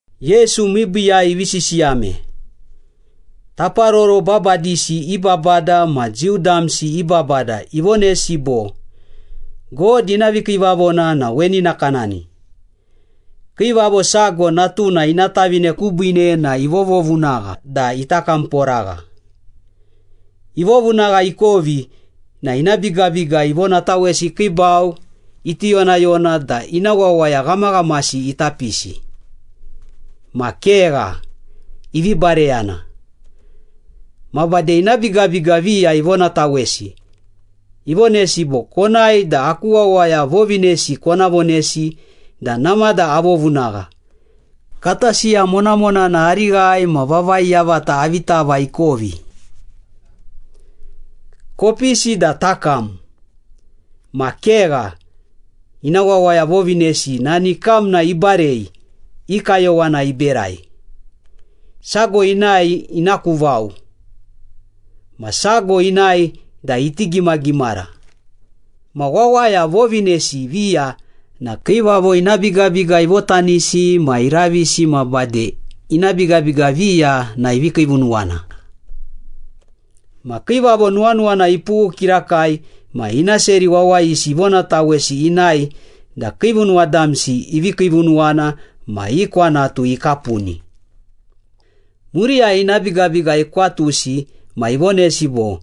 Yesu miibiiyai ivi sisiyame. Taparoro babadisi i babada ma Jiu damsi i babada ivonesi bo, “God ina vikiivavona na weni nakanani. Kiivavo sago natuna ina tavine kubiine na ivovovunagha da ita kamporagha. Ivovunagha ikovi na ina bigabiga ivonatawesi ikiibau iti yonayona da ina wawaya ghamaghamasi ita pisi. Ma kegha, ivi bareyana. Ma bade ina bigabiga viya ivonatawesi, ivonesi bo, ‘Konae, da aku wawaya vovinesi kona vonesi da namada avovunagha, kata siya monamonana arighai ma vavai yavata avi tava ikovi. Kopisi da takam.’ Ma kegha, ina wawaya vovinesi nani kamna ibarei, i kayowana iberai. Sago inae ina ku vao, ma sago inae da iti gimagimara. Ma wawaya vovinesi viya na kiivavo ina bigabiga ivotanisi ma iravisi ma bade ina bigabiga viya na ivi kiivunuwana. Ma kiivavo nuwanuwana ipughu kirakai ma ina seri wawayisi ivonatawesi inae da kiivunuwa damsi ivi kiivunuwana ma i kwanatu ikapuni. Muriyai ina bigabiga ikwatusi ma ivonesi bo,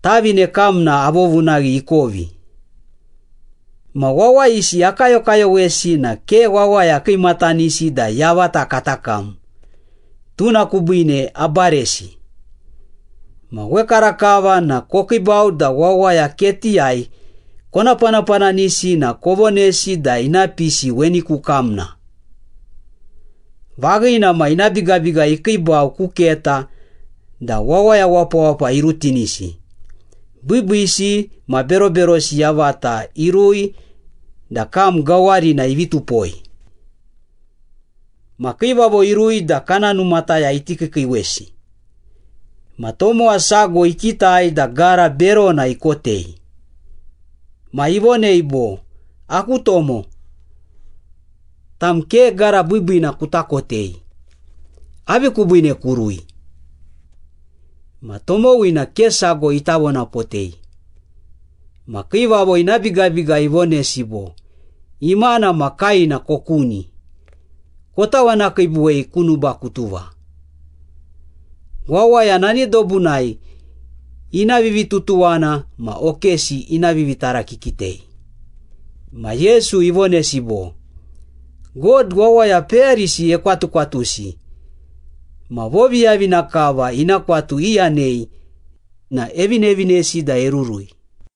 ‘Tavine kamna avovunaghi ikovi. Ma wawayisi akayokayowesi na ke wawaya kiimatanisi da yavata kata kam, tuna kubiine abaresi. Ma wekarakava na kokiibau da wawaya ketiyai kona panapananisi na kovonesi da ina pisi weni ku kamna.’ Vaghina ma, ina bigabiga ikiibau ku keta da wawaya wapawapa irutinisi, biibiisi ma beroberosi yavata irui da kam gawarina ivi tupoi.” “Ma kiivavo irui da kana numataya iti kiikiiwesi. Ma tomowa sago ikitai da gara berona ikotei. Ma ivonei bo, ‘Aku tomo, tam ke gara biibiina kuta kotei. Avi kubiine kurui?’ Ma tomowina ke sago ita vonapotei. Ma kiivavo ina bigabiga ivonesi bo, ‘Imana ma kaena kokuni, kotawanakiibuwei ku nubakutuva. Wawaya nani dobunai ina vivitutuwana ma okesi ina vivitarakikitei.’” Ma Yesu ivonesi bo, “God wawaya peyarisi ekwatukwatusi ma voviyavina kava ina kwatu iyanei na evinevinesi da erurui.”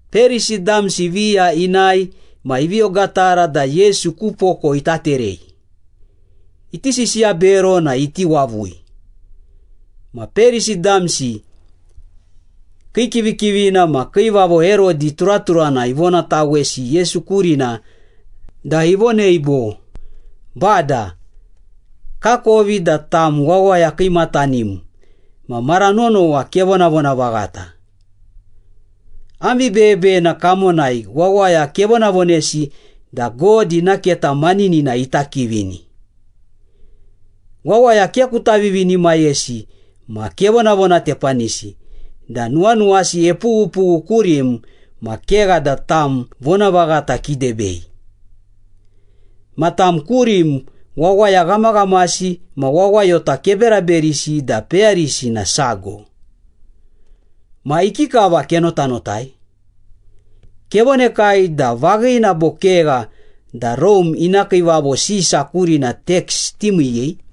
Perisi damsi viya inae ma ivi ogatara da Yesu ku poko ita terei, iti sisiya bero na iti wavui. Ma Perisi damsi kii kivikivina ma Kiivavo Herodi turaturana ivonatawesi Yesu kurina da ivonei bo, “Bada, kakovi da tam wawaya kiimatanim ma mara nonowa kevonavona vaghata. Am vibeyebeyena kamonai wawaya kevonavonesi da God ina keta maninina ita kivini. Wawaya ke kuta vivinimayesi ma kevonavonatepanisi da nuwanuwasi epughupughu kurim ma kegha da tam vonavaghata kidebei. Ma tam kurim wawaya ghamaghamasi ma wawayota keberaberisi da peyarisi na sago. Ma ikikava kenotanotai? Kevonekai da vaghina bo kegha da Rome ina Kiivavo Sisa kurina teks timiiyei?”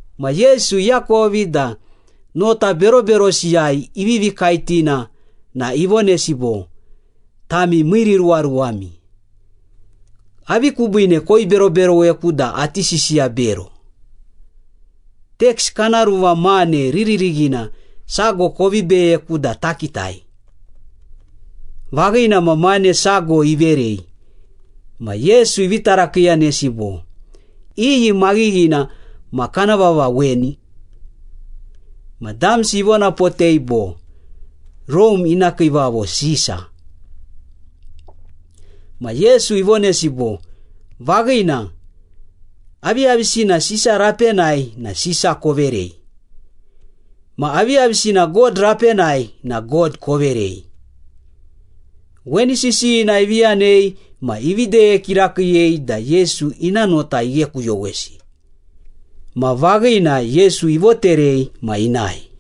Ma Yesu iakovi da nota beroberosiyai ivivi kaetina na ivonesi bo, “Tami miiriruwaruwami. Avi kubiine koiberoberoweku da ati sisiya bero? Teks kana ruva mane riririghina sago kovi beyeku da takitai.” Vaghina ma, mane sago iverei, ma Yesu ivi tarakiiyanesi bo, “Iyi maghighina ma kana vava weni?” Ma damsi ivonapotei bo, “Rome ina Kiivavo Sisa.” Ma Yesu ivonesi bo, “Vaghina, aviyavisina Sisa rapenai na Sisa koverei. Ma aviyavisina God rapenai na God koverei.” Weni sisiyina ivi yanei ma ivi deye kirakiiyei da Yesu ina nota ighekuyowesi. Ma vaghina, Yesu ivoterei ma inae.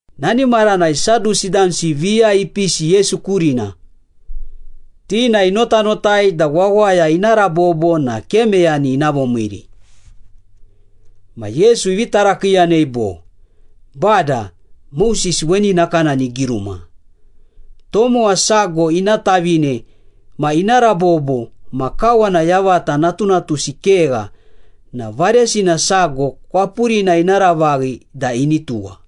Nani maranai Sadusi damsi viya ipisi Yesu kurina. Ti na inotanotai da wawaya ina rabobo na ke meyani ina vomiiri. Ma Yesu ivi tarakiiyanei bo, “Bada, Moses weni nakanani igiruma. ‘Tomowa sago ina tavine ma ina rabobo ma kawana yavata natunatusi kegha na varesina sago kwapurina ina ravaghi da ini tuwa.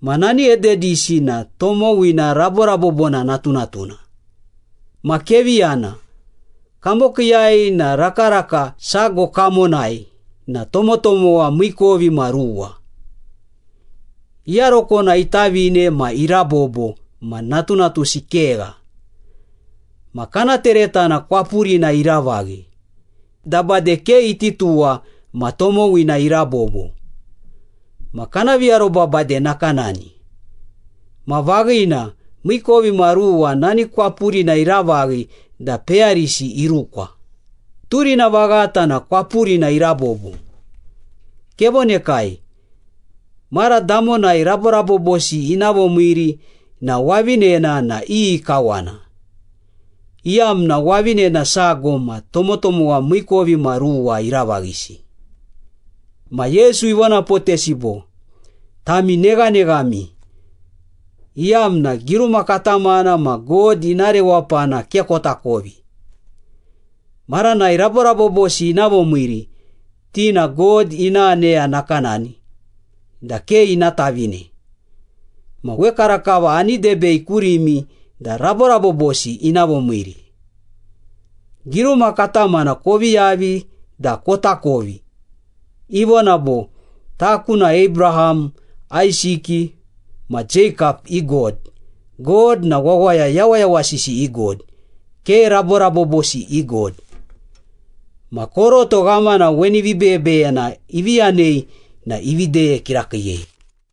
Ma nani ededisi na tomowina raborabobona natunatuna. Ma kevi yana. Kamokiiyai na rakaraka sago kamonai na tomotomowa miikovimaruwa. Iyarokona itavine ma irabobo ma natunatusi kegha. Ma kana teretana kwapurina iravaghi da bade ke iti tuwa ma tomowina irabobo. Ma kana viaroba bade nakanani. Ma vaghina, miikovimaruwa nani kwapurina iravaghi da peyarisi irukwa. Turina vaghata na kwapurina irabobo. Kevonekai, mara damonai raborabobosi ina vomiiri na wavinena na iyi kawana, iyamna wavinena sago ma tomotomowa miikovimaruwa iravaghisi.’” Ma Yesu ivonapotesi bo, “Tami neghaneghami, iyamna giruma katamana ma God ina rewapana ke kotakovi. Maranai raborabobosi ina vomiiri, ti na God ina aneya nakanani da ke ina tavine. Ma wekarakava ani debei kurimi da raborabobosi ina vomiiri. Giruma katamana kovi yavi da kotakovi. Ivona bo, ‘Taku na Abraham, Aisiki ma Jeikap i God.’ God na wawaya yawayawasisi i God, ke raborabobosi i God.” Ma koroto ghamana weni vibeyebeyena ivi yanei na ivi deye kirakiiyei.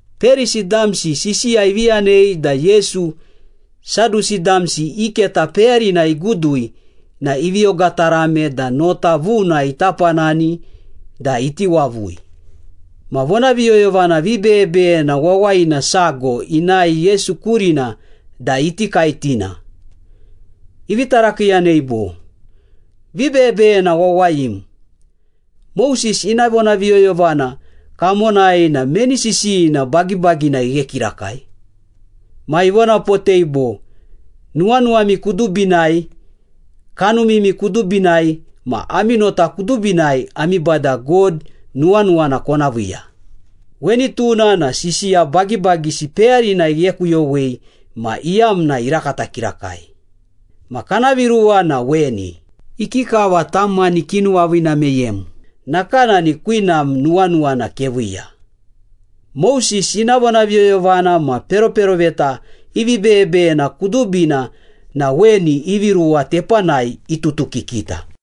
Perisi damsi sisiya ivi yanei da Yesu, Sadusi damsi i keta peyarina igudui na ivi ogatarame da nota vuna ita panani da iti wavui. Ma vonaviyoyovana vibeyebeyena wawayina sago inae Yesu kurina da iti kaetina. Ivi tarakiiyanei bo, “Vibeyebeyena wawayim, Moses ina vonaviyoyovana kamonai na meni sisiyina bagibagina ighe kirakai?” Ma ivonapotei bo, “‘Nuwanuwami kudubinai, kanumimi kudubinai ma ami nota kudubinai ami Bada God nuwanuwana kona viiya.’ Weni tuna na sisiya bagibagisi peyarina ighekuyowei ma iyamna irakata kirakai. Ma kana viruwa na weni, ‘Ikikava tam mani kinuwaviina meyem, nakanani kwinam nuwanuwana keviiya.’ Moses ina vonaviyoyovana ma peroperoveta i vibeyebeyena kudubina na weni ivi ruwa tepanai iututukikita.”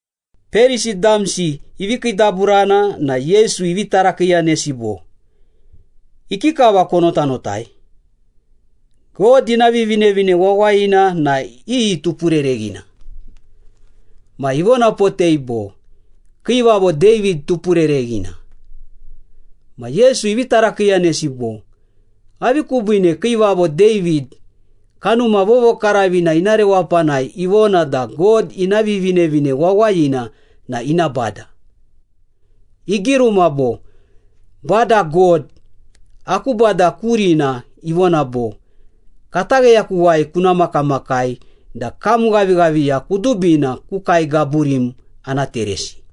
Perisi damsi ivi kiidaburana na Yesu ivi tarakiiyanesi bo, “Ikikava konotanotai? God ina Vivinevine Wawayina na iyi tupurereghina?” Ma ivonapotei bo, “Kiivavo David tupurereghina.” Ma Yesu ivi tarakiiyanesi bo, “Avi kubiine Kiivavo David, Kanuma Vovokaravina ina rewapanai ivona da God ina Vivinevine Wawayina na ina Bada? Igiruma bo, ‘Bada God, aku Bada kurina ivona bo, Katagheyakuwai kuna makamakai da kam ghavighaviya kudubina ku kae gaburim ana teresi.’”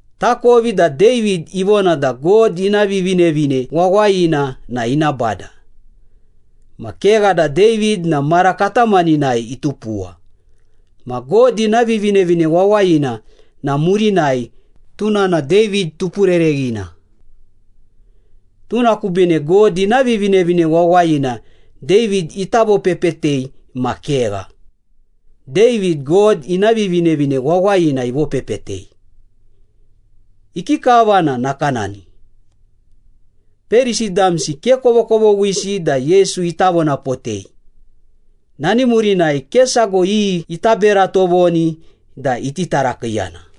“Takovi da David ivona da God ina Vivinevine Wawayina na ina Bada. Ma kegha da David na mara katamaninai itupuwa, ma God ina Vivinevine Wawayina na murinai, tuna na David tupurereghina. Tuna kubiine God ina Vivinevine Wawayina David ita vopepetei ma kegha, David, God ina Vivinevine Wawayina ivopepetei. Ikikava na nakanani?” Perisi damsi ke kovokovoghisi da Yesu ita vonapotei. Nani murinai ke sago iyi ita bera tovoni da iti tarakiiyana.